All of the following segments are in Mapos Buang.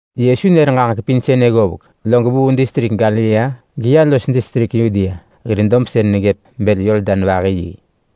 Yesu nër ġaġek pin sënë ggovek, log vuu distrik Galilea geya los distrik Yudea hir dob sën neggëp bël Yordan vahi yi.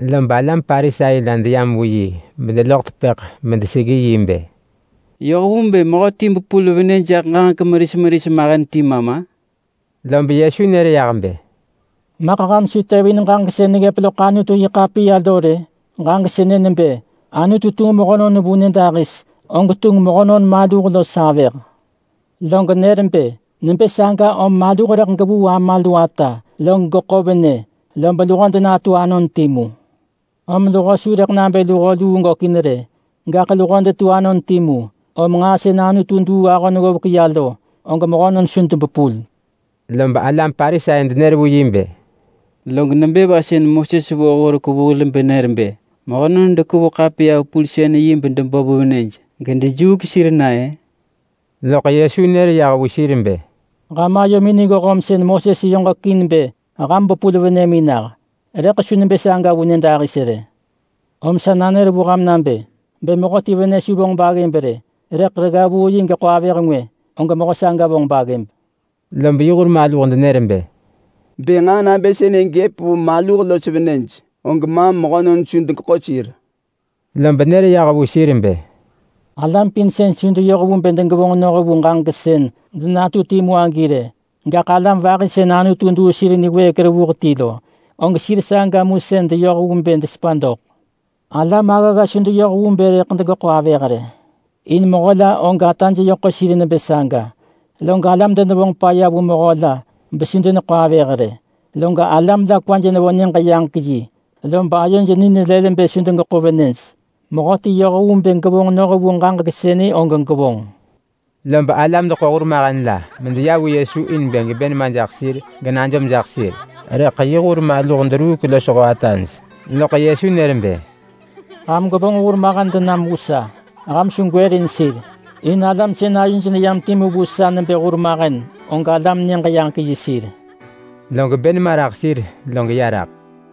Lob alam Parisai la deyam vu yi bedeloḳ tepëḳ bedeseggi yi bë, “Yoh vu bë mehöti bepul venë jaḳ ġaġek meris meris mahen ti ma ma?” Lob Yesu nër yah bë, “Maḳ ham su tevin ġaġek sën neggëp loḳ Anutu-yi-ḳapiya lo rë? Ġaġek sënë nebë Anutu tunġ mehönon vu nyëdahis, og tunġ mehönon maluh los avëh! Log nër bë, ‘Nebë saga om maluh rëḳ gevuu ama lu ata, log geḳo venë, lob luho denatu anon timu’! Om luho su rëḳ nabë luho luu gökin rë, gaḳ luho detu anon timu. Om nġaa sën Anutu duu ahon ggovek ya lo, og mehönon su debepul.” Lob alam Parisai denër vu yi bë, “Log nebë va sën Moses vo horek vu hil benër bë mehönon dekevu ḳapiya-vepulsën-yi bedebo vu venëj gedejuuk sir na-ë?” Loḳ Yesu nër yah vu sir bë, “Ham ayomin niggoh om sën Moses yoġekin bë ham bepul venëmin nah. Rëḳ su nebë saga vu nyëdahis rë. Om sa nanër vu ham nabë: Bë mehöti venë su vonġ baggëb rë, rëḳ regga vuu yi geḳo avëh ngwë, og mehö saga vonġ baggëb.” Lob yi hur maluh denër bë, “Bë nġaa nabë sënë gëp vu maluh los venëj, og maam mehönon su degeḳo sir.” Lob nër yah vu sir bë, “Alam pin su deyoh vu bë degevonġ noh vu ġaġek sën denatu timu agi rë, gaḳ alam vahi sën Anutu duu sir niwëëk revuh ti lo, og sir saga mu sën deyoh vu bë desepa doḳ. Alam aggagga su deyoh vu bë rëḳ degeḳo avëh rë. In mehö la og ataj yö ḳo sir nebë saga. Log alam denevonġ paya vu mehö la besu deneḳo avëh rë. Log alam la kwaj nevo Nyëġ-yaġek-yi, lob ayoj ni nelël bë su degeḳo venëj. Mehöti yoh vu bë gevonġ noh vu ġaġek sënë og gevonġ.” Lob alam deḳo hurmahen la medeya vu Yesu in bë gebë nema jaḳ sir genajom jaḳ sir. Rëḳ yi hur maluh deruuk losho ataj. Loḳ Yesu nër bë, “Ham gwevonġ hurmahen denam vu sa. Ham su gwërin sir, in alam sën ayoj neyam timu vu sa nebë hurmahen, og alam Nyëġ-yaġek-yi sir.” Log bë nema raḳ sir log ya raḳ.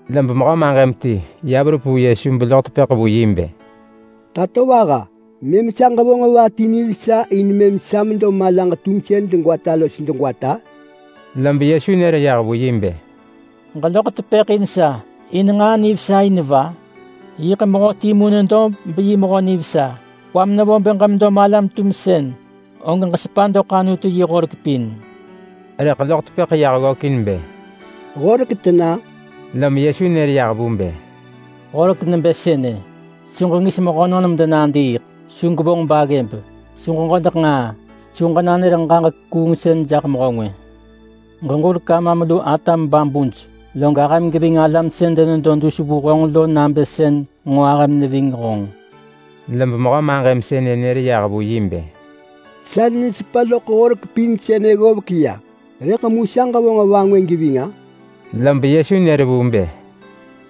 Lob mehö maġëm ti ya verup vu Yesu beloḳ tepëḳ vu yi bë, “Tatovaha! Mëm sa ġevonġ va ti nivesa in mëm sa medo malaġ tumsën degwata los degwata?” Lob Yesu nër yah vu yi bë, “Ġeloḳ tepëḳ in sa in nġaa nivesa in va? Yiḳ Mehö timu nedo beyi mehö nivesa! Kwam nevo bë ġemedo malam-tumsën, og ġesepa doḳ Anutu yi horek pin!” Rëḳ loḳ tepëḳ yah ggökin bë, “Horek tena?” Lom Yesu nër yah vu bë, “Horek nebë sënë: Su ġengis mehönon medenadiiḳ! Su gwevonġ baggëb! Su ġeġodeḳ nġaa! Su ġenanër ġaġek kuungsën jaḳ mehö ngwë! Ġeġurek amam lu atam babuj! Log ahëm geving alam sën denedo dus vu honġ lo nabë sën nġo ahëm neving honġ!” Lob mehö maġëm sënë nër yah vu yi bë, “Sa nesepa loḳ horek pin sënë ggovek ya. Rëḳ mu sa ġevonġ va ngwë geving-a?” Lob Yesu nër vu bë,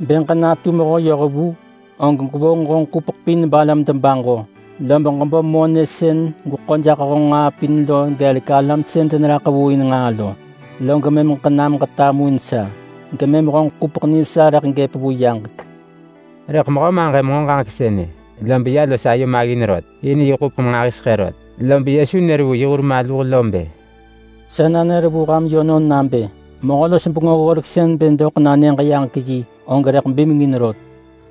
“Bë ġenatu mehö yohvu, og gwevonġ honġ ḳupeḳ pin balam debaġo, lob ġebo monë sën gweḳo jaḳ honġ nġaa pin lo vu alam sën deneraḳ vu in nġaa lo, log mëm ġenam ġetamuin sa, gemëm honġ ḳupeḳ nivesa rëḳ gëp vu yaġek.” Rëḳ mehö maġëm nġo ġaġek sënë, lob ya los ayo maggin rot, in yi ḳupeḳ nġahiseḳë rot. Lob Yesu nër vu yi hur maluh bë, “Sa nanër vu ham yönon nabë mehö-los-bengö-ggoreksën bë doḳ na Nyëġ-yaġek-yi, og rëḳ bimengin rot.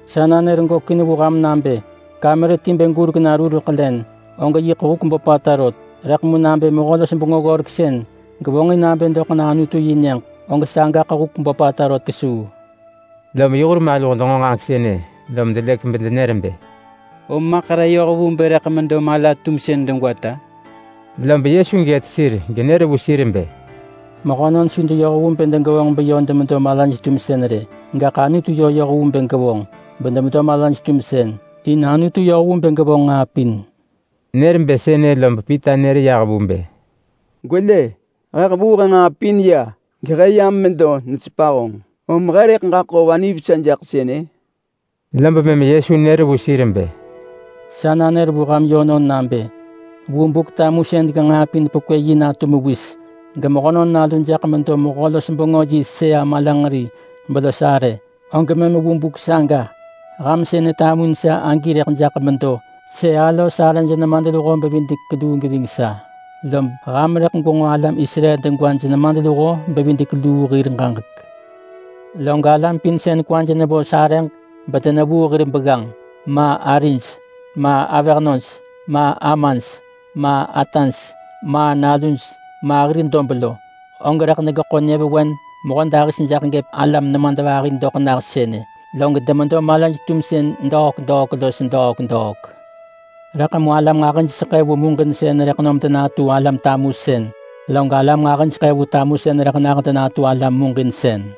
Sa nanër gökin vu ham nabë kamer ti bë gurek na rureḳ len, og yiḳ huk böpata rot, rëḳ mu nabë mehö-los-bengö-ggoreksën gevonġin nabë doḳ na Anutu yi nyëġ, og sagaḳ huk böpata rot kesuu.” Lom yi hur maluh denġo ġaġek sënë lom delëk bedenër bë, “Om maḳ re yoh vu bë rëḳ medo mala-tumsën degwata?” Lob Yesu gët sir genër vu sir bë, “Mehönon su deyoh vu bë degevonġ beyö demedo malaj-tumsën rë, gaḳ Anutu yö yoh vu bë gevonġ bedemedo malaj-tumsën. In Anutu yoh vu bë gevonġ nġaa pin.” Nër bë sënë lob Pita nër yah vu bë, “Gwelë! He hevuu he nġaa pin ya gehe yam medo nesepa honġ, om he rëḳ ġaḳo va nivesa jaḳ sënë?” Lob mëm Yesu nër vu sir bë, “Sa nanër vu ham yönon nabë vu Buk-tumusën genġaa pin pekwë yi natu mewis, geMehönon Nalu jaḳ medo mehö-los-bengö yi sëa malanġeri belos arë, og mëm vu buk saga ham sën netamuin sa agi rëḳ jaḳ medo sëa-los-arëj nemadluho-bevidek-luu geving sa. Lob ham rëḳ gwenġo alam Israel degwaj nemadluho-bevidek-luu hir ġaġek. Log alam pin sën kwaj nevo sarëġ bedenevuu hir begganġ, ma arij, ma avëhnöj, ma amaj, ma ataj, ma naluj, ma hir dob lo, og rëḳ degeḳo nyëvewen mehödahis jaḳ gëp alam nemadvahi doḳ nah sënë, log demedo malaj-tumsën degwata los degwata. Rëḳ mu alam nġahijseḳë vu muġinsën rëḳ nom denatu alam tamusën, log alam nġahijseḳë vu tamusën rëḳ nah denatu alam muġinsën.”